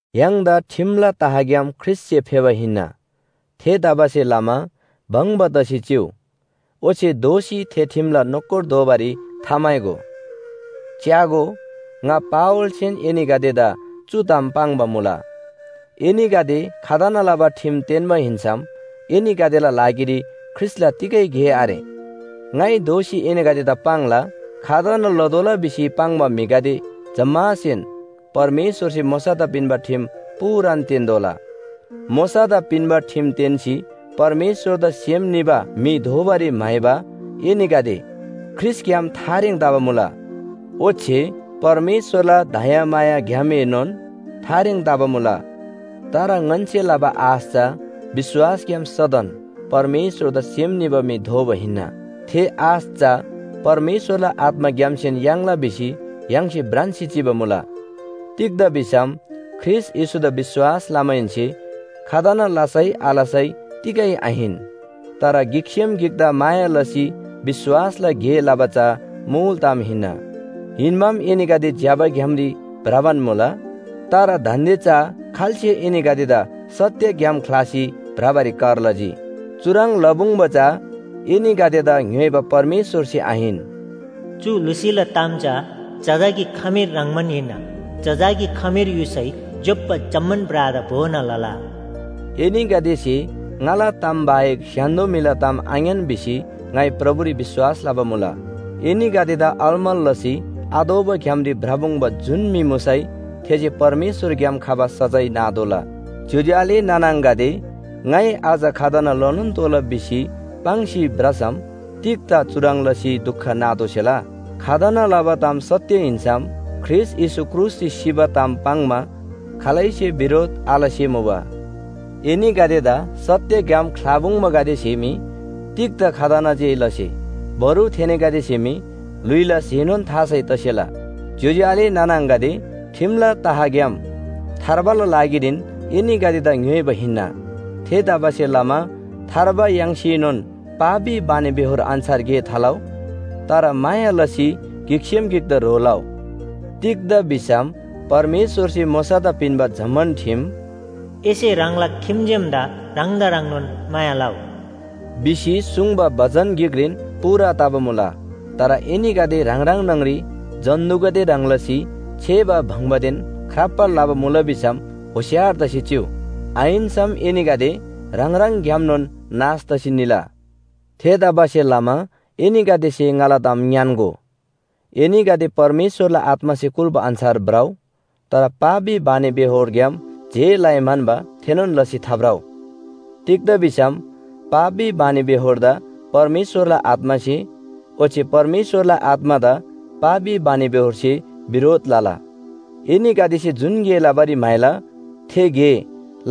य्‍हाङदा ठिमला तहग्‍याम ख्रीष्‍टसे फेबा हिन्‍ना। थेतबासेलमा भङ्‍बा तसी चिउ, ओच्‍छे दोःसी थे ठिमला नोकर दोबारी थाम्‍हाइगो। च्‍यागो, ङा पावलसेन एनीगदेदा चु ताम पाङ्बा मुला, एनीगदे खतना लबा ठिम तेन्‍बा हिन्‍सम एनीगदेला लागिरी ख्रीष्‍टला तिगै गे आरे। ङाइ दोःसी एनीगदेदा पाङ्ला, खतना लतोःला भिसी पाङ्बा म्‍हिगदे जम्‍मासेन परमेश्‍वरसे मोशादा पिन्‍बा ठिम पूरान तेन्‍तोःला। मोशादा पिन्‍बा ठिम तेन्‍सी परमेश्‍वरदा सेम निबा म्‍हि दोबारी म्‍हाइबा एनीगदे ख्रीष्‍टग्‍याम थारेङ तबा मुला। ओच्‍छे परमेश्‍वरला दयामायाग्‍यामएनोन थारेङ तबा मुला। तर ङन्‍से लबा आश चा विश्‍वासग्‍याम सदन परमेश्‍वरदा सेम निबा म्‍हि दोबा हिन्‍ना। थे आश चा परमेश्‍वरला आत्‍माग्‍यामसेन याङ्ला भिसी य्‍हाङसे भ्रान्‍सी चिबा मुला। तिग्‍दा भिसम ख्रीष्‍ट येशूदा विश्‍वास लमाहेन्‍से खतना लसै आलसै तिगै आहिन। तर गिकसेम गिकदा माया लसी विश्‍वासला गे लबा चा मुल ताम हिन्‍ना। हिन्‍बाम एनीगदे ज्‍यबा ग्‍यामरी भ्रबान मुबा। तर दान्‍दे चा खाल्‍से एनीगदेदा सत्‍य ग्‍याम ख्‍लासी भ्रबारी कर लजी। चुह्रङ् लपुङ्बा चा एनीगदेदा ङ्‌योइबा परमेश्‍वरसे आहिन। चु लुसीला ताम चा जजाकी खमीर ह्रङ्‌बान हिन्‍ना। जजाकी खमीर युसै ज्‍योप्‍बा जम्‍मान ब्रादा भोना लला। एनीगदेसे ङाला ताम बाहेक स्‍य्‍हान्‍दो म्‍हिला ताम आङ्‌यान भिसी ङाइ प्रभुरी विश्‍वास लबा मुला। एनीगदेदा अलमल लसी आतोःबा ग्‍यामरी भ्रपुङ्बा जुन म्‍हि मुसै थेसे परमेश्‍वरग्‍याम खबा सजाय नातोःला। ज्‍योज्‍यो आले नाना आङागदे, ङाइ अझ खतना लनोन तोःला भिसी पाङ्सी भ्रसम तिग्‍दा चुह्रङ् लसी दुख नातोःसेला। खतना लबा ताम सत्‍य हिन्‍सम ख्रीष्‍ट येशू क्रुसरी सिबा ताम पाङ्‌मा खालैसेन बिरोध आलसे मुबा। एनीगदेदा सत्‍य ग्‍याम ख्‍लापुङ्बागदेसे मी तिग्‍दा खतना जे लसे, बरु थेनीगदेसे मी ल्‍हुइला स्‍हेनोन थासै तसेला। ज्‍योज्‍यो आले नाना आङागदे, ठिमला तहग्‍याम थार्बाला लागिरीन एनीगदेदा ङ्‌योइबा हिन्‍ना। थेतबासेलमा थार्बा याङ्सीनोन पापी बानीबेहोर अन्‍छार गे थालउ। तर माया लसी गिकसेम गिकदा ह्रो लउ। तिग्‍दा भिसम परमेश्‍वरसे मोशादा पिन्‍बा जम्‍मान ठिम “एसे ह्राङला खिम्‍जेमदा ह्राङदा ह्रङ्नोन माया लउ” भिसी सुङ्बा बचन गिकरीन पूरा तबा मुला। तर एनीगदे ह्राङ ह्राङ न्‍हङरी जन्‍तुगदे ह्रङ् लसी छेबा बङ्बादेन ख्राप्‍बा लबा मुला भिसम होशियार तसी चिउ। आहिन्‍सम एनीगदे ह्राङ ह्राङग्‍यामनोन नाश तसी निला। थेतबासेलमा एनीगदेसे ङाला ताम ङ्‌यान्‍गो, एनीगदे परमेश्‍वरला आत्‍मासे कुल्‍बा अन्‍छार भ्रउ। तर पापी बानीबेहोरग्‍याम जे लइ म्‍हन्‍बा थेनोन लसी थाभ्रउ। तिग्‍दा भिसम पापी बानीबेहोरदा परमेश्‍वरला आत्‍मासे ओच्‍छे परमेश्‍वरला आत्‍मादा पापी बानीबेहोरसे बिरोध लला। एनीगदेसे जुन गे लबारी म्‍हाइला थे गे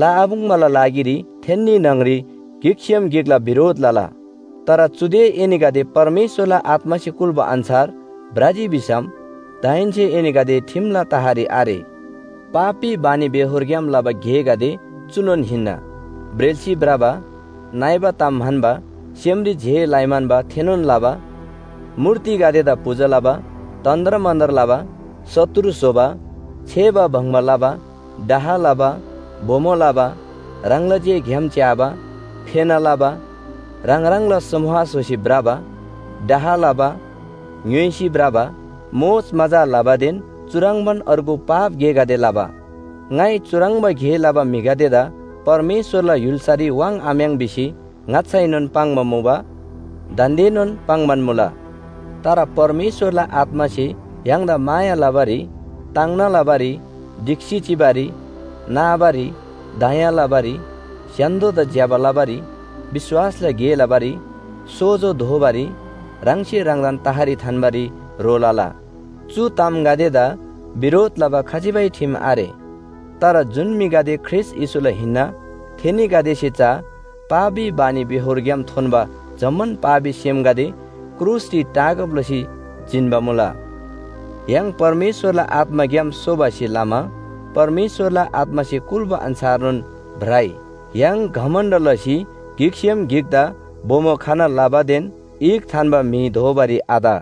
लआपुङ्बाला लागिरी थेन्‍नी न्‍हङरी गिकसेम गिकला बिरोध लला। तर चुदे एनीगदे परमेश्‍वरला आत्‍मासे कुल्‍बा अन्‍छार भ्रजी भिसम दाहेन्‍से एनीगदे ठिमला तहरी आरे। पापी बानीबेहोरग्‍याम लबा गेगदे चुनोन हिन्‍ना: ब्रेल्‍सी भ्रबा, नइबा ताम म्‍हन्‍बा, सेमरी जे लइ म्‍हन्‍बा थेनोन लबा, मूर्तिगदेदा पूजा लबा, तन्‍त्रमन्‍त्र लबा, शत्रु स्‍होबा, छेबा बङ्बा लबा, डाह लबा, बोमो लबा, ह्राङला जे ग्‍याम च्‍याबा, फेना लबा, ह्राङ ह्राङला समूह स्‍होसी भ्रबा, डाह लबा, ङ्‌य्‍होइसी भ्रबा, मोजमजा लबादेन चुह्रङ्बान अर्गु पाप गेगदे लबा। ङाइ चुह्रङ्बा गे लबा म्‍हिगदेदा परमेश्‍वरला य्‍हुल्‍सारी वाङ्‌आम्‍याङ् भिसी ङाच्‍छाएनोन पाङ्बा मुबा, दान्‍देनोन पाङ्‌बान मुला। तर परमेश्‍वरला आत्‍मासे य्‍हाङदा माया लबारी, ताङ्ना लबारी, ढिक्‍सी चिबारी, नाबारी, दया लबारी, स्‍य्‍हान्‍दोदा ज्‍यबा लबारी, विश्‍वासला गे लबारी, सोजो दोबारी, ह्राङसे ह्राङदान तहरी थान्‍बारी ह्रो लला। चु तामगदेदा बिरोध लबा खजिबै ठिम आरे। तर जुन म्‍हिगदे ख्रीष्‍ट येशूला हिन्‍ना, थेनीगदेसे चा पापी बानीबेहोरग्‍याम थोन्‍बा जम्‍मान पापी सेमगदे क्रुसरी टाँगब लसी जिन्‍बा मुला। य्‍हाङ परमेश्‍वरला आत्‍माग्‍याम सोबासे लमा परमेश्‍वरला आत्‍मासे कुल्‍बा अन्‍छारनोन भ्रइ। य्‍हाङ घमण्‍ड लसी गिकसे गिकदा बोमो खना लबादेन ईख थान्‍बा म्‍हि दोबारी आत।